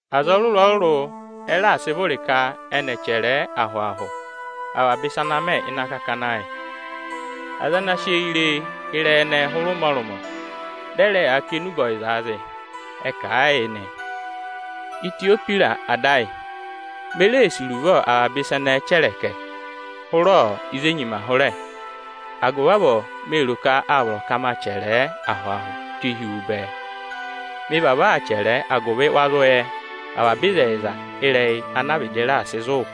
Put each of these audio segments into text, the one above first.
Aza ọrụrụ-ọrụrụ ẹ raà sị vụrị ka ẹnị ẹ̀ chẹrẹ ẹ ahụ-ahụ avaba ịsa ana mẹ ịnị akakana ẹ yị. Aza ana sị eyi re ịrẹyị ẹnẹẹ hụrẹ ụmọrụmọ, dị ẹ rẹ yaa kà enube ọyịzaa zị, ẹ kà a yị nị. Itiyohwịrọsị ada ayị, me reè sì iruvo avaba ịsa ẹnẹẹ chẹrẹkẹ hụrẹ ịzị e nyima hụrẹ. Agụvị avọọ mee ro ka â vọrọ ka ma chẹrẹ ẹ ahụ-ahụ tụ́ hi wu bẹẹ. Mị vavọọ aa chẹrẹ ẹ, agụvị wa zụ yẹ avaba ịzẹyịza ịrẹyị ana vịdị raà sị zụ̀ wụ.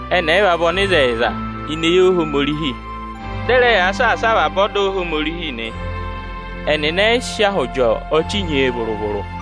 Ẹnị ẹyịva vị ọnịzẹyịza ini eyi Ohomorihi, dị ẹ rẹ yaa saasa avaba ọda Ohomorihi nị. Ẹnịnị ẹ yị sị ahụ jị ọchị nyee vụrụ-vụrụ.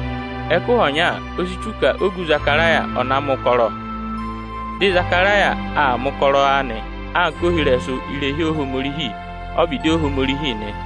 Ẹkụhị ọnya, o si tù ka ogu Ịzakaraya ọ̀ na mẹ̀ ụkọrọ. Dị Ịzakaraya aa mẹ̀ ụkọrọ anị anka ohirẹsụ irehi Ohomorihi ọ́vịdị Ohomorihi nị.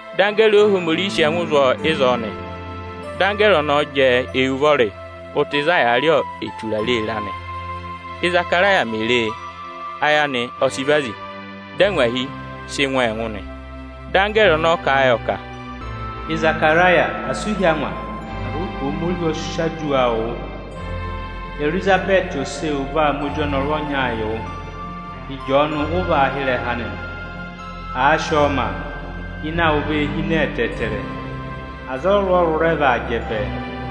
Dị anggẹẹrị Ohomorihi sị ẹngụ zụ̀ ọọ ịzọọ nị. Dị anggẹẹrị ọnọọ jẹẹ eyi ụvọrị ụta ịzị a yàā rị eturare ịra nị. Ízakaraya mè ree, ayị anị ọ sị vazi, dị angwahi sị ngụ ọọ ẹngụ nị Dị anggẹẹrị ọnọọ kà a yọ ka, “Ịzakaraya, asị u hí angwa agụvị ka Ohomorihi ọ raà wụ́ aduwa awụ. Erizabẹẹtị ose ewu vaa ma ozi ọnọrụ ọnyaa yị wụ, Ịjọọnụ ụ vaa yị ọ nị. Àa sị ọọ ma, ịnẹ awụ vee hine ẹtẹẹtẹrẹ. Aza ọrụrụ-ọrụrụ rẹ vaa jẹ bẹẹ.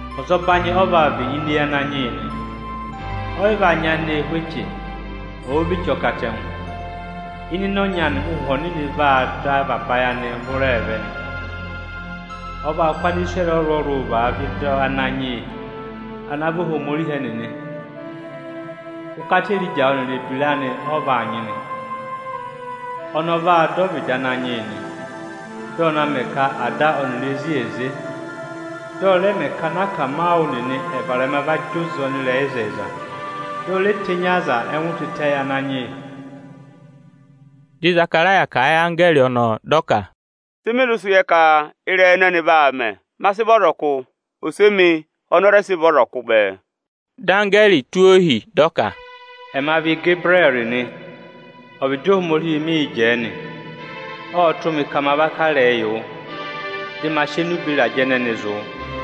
Ọzọbanyị ọ vaa vị ini eyi Ananyị yị nị. Ọ yị va nyayịnẹ ẹ hú eche vụrụ-vụrụ, ọ̀ daka vị eche ọkatẹngụ. Hụụnị ịnị ịnẹ ọnyị anị Ụ́hwẹ Ọnịnị vaa dọ avaba ayị anịị hụrẹẹ vẹ nị. Ọ vaa kụ́ Anisirẹrị ọrụrụ-ọrụrụ vaavẹ ịdị Ananyị yị ana vị Ohomorihi ẹnịnị. Ụkata Erija ọnịrị ebira anị ọ vaa nyị nị. Ọnị ọ vaa dọ ọvịdị Ananyị yị nị. Ọ vaa mẹ ka ada ọnịrị ezi è ze. Dị ọ rẹ mẹ ka anakamawụ nịnị ẹ̀ varẹma va zị oze ọnịrẹyịzẹyịza. Dị ọ re tenyi aza ẹngụ tịtẹ yị Ananyị yị.” Dị Ịzakaraya kà a yị anggẹẹrị ọnọọ, dị ọ ka, “Sị mị zụ sị yẹ ka ịrẹyị ọnọnị vaa mẹ? Me si bo, ose emi oni o re si bo bẹẹ.” Dị anggẹẹrị tụ́ ọọ ohi dị ọ ka, “Ẹma vị Igebirẹẹrị nị. Ọvịdị Ohomorihi mịị̄ jẹẹ nị. Ộ tụ́ mị ka ma va kà ịrẹyị yị wụ, dị ma sị enube ịrajẹ ọnọnị va yị wụ nị.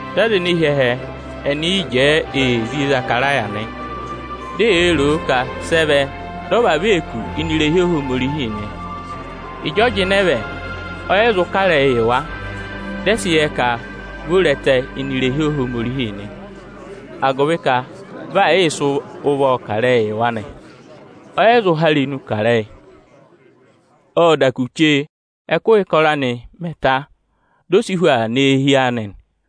Dị aza ene hi ẹhẹ, ẹnị yị jẹẹ ee zí Ịzakaraya nị. Di e yee ro o ka sị ẹ vẹ dị ọ vavọọ ee kù ini irehi Ohomorihi nị. Ịjị ọ jịnẹ vẹ, ọ yị zụ kà ịrẹyị yị wa. Dị ẹ sị yẹ ka vi o re ẹtẹ ini irehi Ohomorihi nị, agụvị ka ụvọ ee sii jị uwe yị wa nị, ọ yị zụ há irenu kà ịrẹyị. Ộ da kù chee ẹ́kụhị ụkọrọ anị mẹ̀ ta, di o si hu aa nọ eehi anị nị.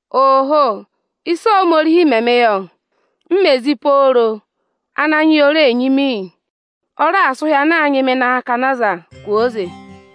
“Aa, ịsị Ohomorihi mẹ mị yọ! Ananyị yị o reè nyị mị iyi. Ọ raà sị ụhị ana aa nyị mị ịnị akakana aza kwooze!”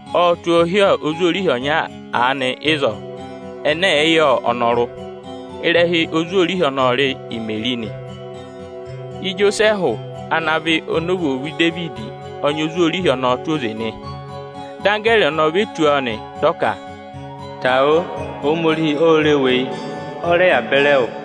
Ộ tụ́ ọọ hi ozwoorihi ọnya aanị ịzọọ ẹnẹ ẹ̀ẹẹ̀ yị yẹ ọnọrụ. Ịrẹha ozwoorihi ọnọọ ọ rị Imeri nị. Ijosẹẹhụ ana vị anovwoovu Idevidi ọ nyị ozwoorihi ọnọọ tụ́ oze nị. Dị anggẹẹrị ọnọọ ve tù ọọ nị, dị ọ ka, “Tangwa o! Ohomorihi ô re wu eyi, ọ rẹ yà pe wụ.”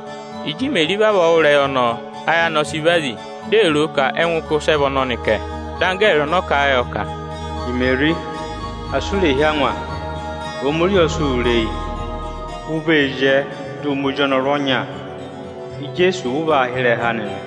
Ịjị Imeri vavọọ wụ́ ịrẹyị ọnọọ, ayị anị ọ sị vazi, di ee ro o ka ẹngụ ụkụ́ ịsị ẹ vị ọnọnị kẹ. Dị anggẹẹrị ọnọọ kà a yọ ka, “Imeri, asị u rè hí angwa, Ohomorihi ọ sị wụ re eyi. U vee zyẹẹ dị ụ ma ozi ọnọrụ ọnya, Ijeesu ụ vaa hị́ ịrẹha anị nị.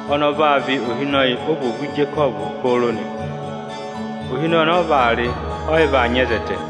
Ọnị ọ vaa vị ohinọyị ovwoovu Ijekọvụ pooro nị. Ohinọyị ọnị ọ vaa rị, ọ yị vaa nyị ẹzẹtẹ.”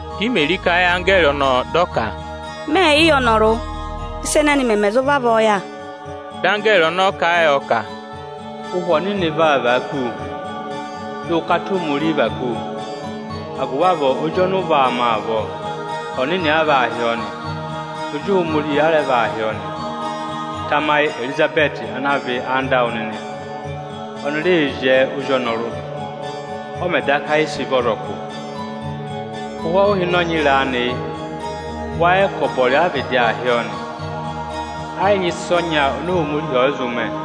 Dị Imeri kà a yị anggẹẹrị ọnọọ dị ọ ka, “Mẹẹ̀ yị yẹ ọnọrụ, ị́sa ẹnẹnị mẹmẹ zụ vavọọ yà?” Dị anggẹẹrị ọnọọ kà a yọ ka, “Ụhwẹ Ọnịnị vaa vàa kú wu, dị ụkata Ohomorihi và kú wu, agụvị avọọ ozi ọnị ụ vaa ma avọọ, ọnịnị a vaa hị́ ọ nị, Ozi Ohomorihi a rẹ vaa hị́ ọ nị. Tamayị Erizabẹẹtị ana vị anda awụ nịnị, oni ree zyẹẹ ozi ọnọrụ, ọ mẹ̀ daka yị sị vị ọzọkụ. Ụhwẹ ọhụhịnọnyị ịrẹẹ anị yị; wâ yẹ ka ọbọrị a vịdị aa hị́ ọọ nị. Ẹ yị nyị ịsa ọnya oni Ohomorihi ọ yị zụ mẹ.”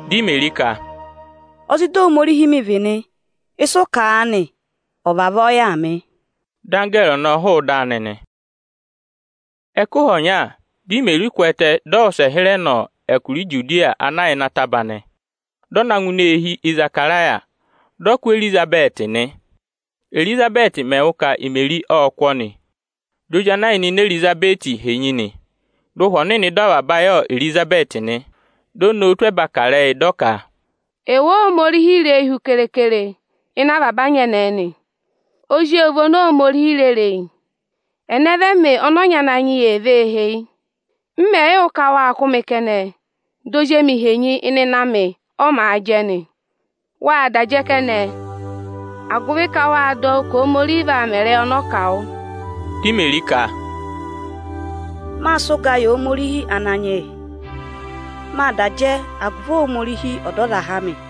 Dị Imeri ka, “Ozida Ohomorihi mị vị nị, ịsị ụ kà aanị, ọ̀ vavọọ yà mị!” Dị anggẹẹrị ọnọọ hụụ ịdị anị nị. Ẹkụhị ọnya, dị Imeri kwẹẹtẹ, dị ọ wụsẹ hịrẹ nọ Ijuda ana yà ịrẹsụ ataba nị. Dị ọ na ngụ ini eehi Ịzakaraya, dị ọ kụ́ Erizabẹẹtị nị. Érizabẹẹtị mẹ̀ wụ́ ka Imeri ộ kụ́ ọnị, di ozi ana yà ịnị ịnẹ Erizabẹẹtị henyi nị, dị Ụhwẹ Ọnịnị dọ avaba ayị Erizabẹẹtị nị. Di o nowu tụ́ ẹba kà ịrẹyị, ka, “Ẹwụ Óhomorihi re eyi hu keekere ịnị avaba anyẹnẹẹ nị. Ozi ewu vị oni Ohomorihi re re eyi bẹẹ. Ẹnẹ vị ẹmị, ọnị ọnyị Ananyị yị ee vee heyi? M mẹ̀ yị wụ́ ka wâ kụ́ mị kẹnẹ, di ozi emi henyi ịnị ịnẹ amị, ọ màa jẹ nị. Wâ da jẹ kẹnẹ, agụvị ka wâ dọ wụ́ ka Ohomorihi vaa mẹ ịrẹyị ọnọọ kà wụ.” Di Imeri ka, “Mâ sị ụga yị Ohomorihi Ananyị yị. Mâ da jẹ agụvị Ohomorihi Ọdọzaha amị,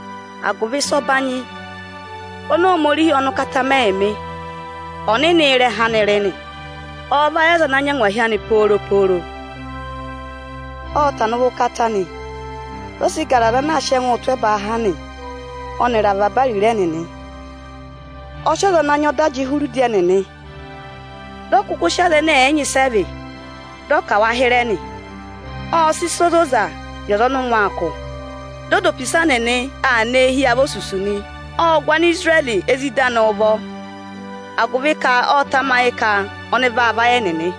agụvị ịsa ọbanyị oni Ohomorihi ọnị ụkata mẹ yị mị. Ọnịnị ị́rẹha anị rị nị. Ọọ̄ vayị aza ana nyị angwahi anị pooro nị. Ộ sị ụvọ anị mẹ̀ ụkọrọ ẹbanyị-ẹbanyị, dị ọ gara aza ana aa sị ẹngụụ tụ́ ẹbaa ha nị, ọnịrị avaba ariro ẹnịnị. Ọ sị aza ana nyị ọda jị hụrẹ udi ẹnịnị. Dị ọ kụkụ sị aza ẹnẹ ẹ̀ yị nyị ịsị ẹ vị, dị ọ kà wa hịrẹ nị. Ộ sị ịsa ozoza yị aza ọnị ụngwẹ aa kụ̀, dị ọ dụ opisa nịnị aa nọ eehi avosusu nị. Ộ gụ Anisirẹrị ezida anị ụvọ, agụvị ka ộ tamayị ka ọnị vaa vayị ẹnịnị,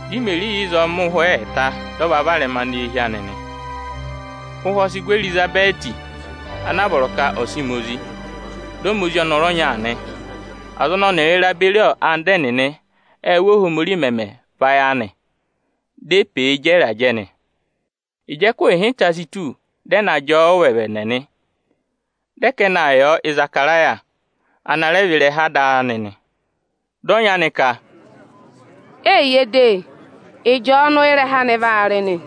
Dị Imeri yà ịzọọ mẹ ụhwẹ ẹẹta, dị ọ va varẹma nọ eehi anị nị. Ụhwẹ ọ sị gụ Erizabẹẹtị ana vọrọ ka ọ̀ sị ma ozi. Dị ọ ma ozi ọnọrụ ọnya nị. Aza ọnị ọnịrịị ra beri anda ẹnịnị ệ wụ́, Óhomorihi mẹmẹ vayị anị; di e pe e jẹ nị. Ịjị ẹkụhị ịhịnta si tù, dị ẹ na jị ọ ụvẹvẹnẹ nị, dị ẹ ka ẹnị aa yị ọ Ịzakaraya, ana rẹ vị ịrẹha ada anị nị. Dị ọnyị anị ka, “Eyiye de, Ịjọọnụ ị́rẹha anị vaa rị nị.”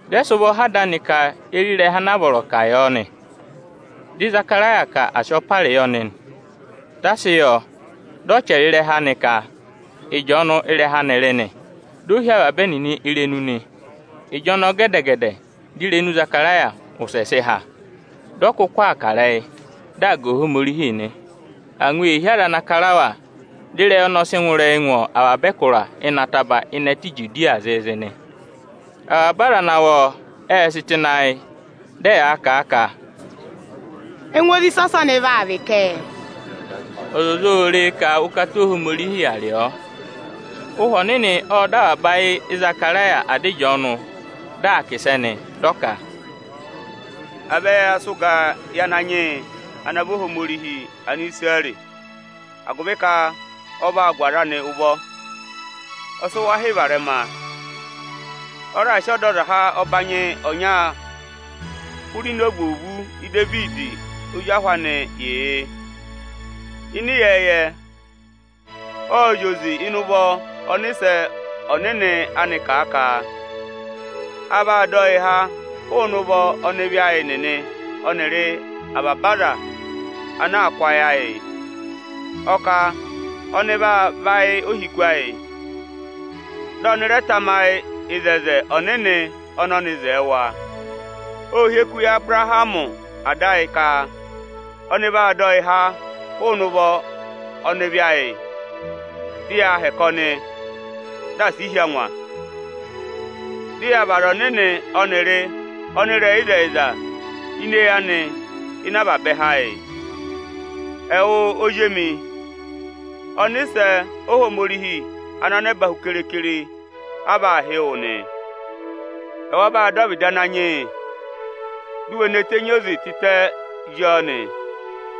Dị ẹ sị ụvọ họ̀ ada anị ka ye re ịrẹha ana vọrọ ka à yị ọ nị. Dị Ịzakaraya ka à sị ọparị yị ọnị nị. Â sị ọ yọ, dị ọ chẹrẹ ịrẹha anị ka, “Ịjọọnụ ị́rẹha anị rị nị.” Di o hí avaba ẹnịnị irenu nị. Ịjọnọọ gẹdẹ-gẹdẹ, di irenu Ịzakaraya wụsẹ sị há, dị ọ kụkụ aa kà ịrẹyị, dị aa ga Ohomorihi nị. Angwa ee hí aza ana ra kara wa, dị ịrẹyị ọnọọ sị ngụ ịrẹyị ngụ avaba ẹkụra ịnị ataba ịnị ẹtẹ Ijudiya zịịzị nị. Avaba aza ana wụ́ ọọ, ệ sị tụ́ ịnị ayị, dị ẹyaa kà a ka, “Ẹngụ ozi ịsị ọsọnị vaa vị kẹ?” Ọzọza ô re e ka ụkata Ohomorihi yà rị ọ. Ụhwẹ Ọnịnị ộ dọ avaba ayị Ịzakaraya, ada Ịjọọnụ, dị aa kà ịsẹ nị, dị ọ ka: “À vẹ ya sị ụga yị Ananyị yị ana vị Ohomorihi Anisirẹrị! Agụvị ka ọ va raà gụ aza anị ụvọ, ọ sị wa hị́ varẹma. Ọ raà sị Ọdọzaha ọbanyị ọnya hụrẹ ini ovwoovu Idevidi ozi ahụ anị yị yị. Ịnị ịyẹẹyẹ, ộ zị oze ịnị ụvọ ọnịsẹ ọnịnị anị kà a ka: A vaa dọ yịị ha hụụnị ụvọ ọnịvị ayị nịnị ọnịrị hụụnị avaba aza ana aa kụ́ ayị ayị. Ọ kà ọnị vaa vayị ohiku ayị, dị ọnị rẹ tamayị oto ọnịnị ọnị ọnị wo yị wa. Ộ hị́ eku yị Abụrahamị ada ayị ka ọnị vaa dọ yịị háa hụụnị ụvọ ọnịvị ayị, dị yaa hẹkẹ ọnị, dị asị i hí angwa; dị ya vị aza ọnịnị ọnịrị ọnịrẹyịzẹyịza ini eyi anị ịnị avaba ẹhẹ ayị. Ẹwụ ozi emi, ọnịsẹ Ohomorihi ana yà ẹbẹẹba keekere a vaa hị́ wụ nị. Ẹwa vaa dọ ọvịdị Ananyị yị, di u we ne tenyi oze tịtẹ zí ọọ nị;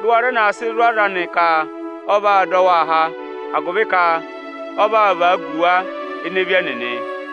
dị ụ wa rẹ na sị zụ̀ aza anị ka ọ vaa dọ waa há, agụvị ka ọ vaa vagu wa ịnị ịvị ẹnịnị.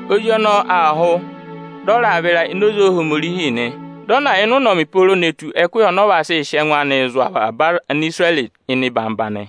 Ozi ọnọọ aa hụ, dị ọ raa vịra ini oze Ohomorihi nị. Dị ọ na yà ịnị ụnọmị pooro ne tù ẹkụhị ọnị ọ va sị sị ẹngụ anịị zụ̀ avaba Anisirẹrị ịnị eyigede nị.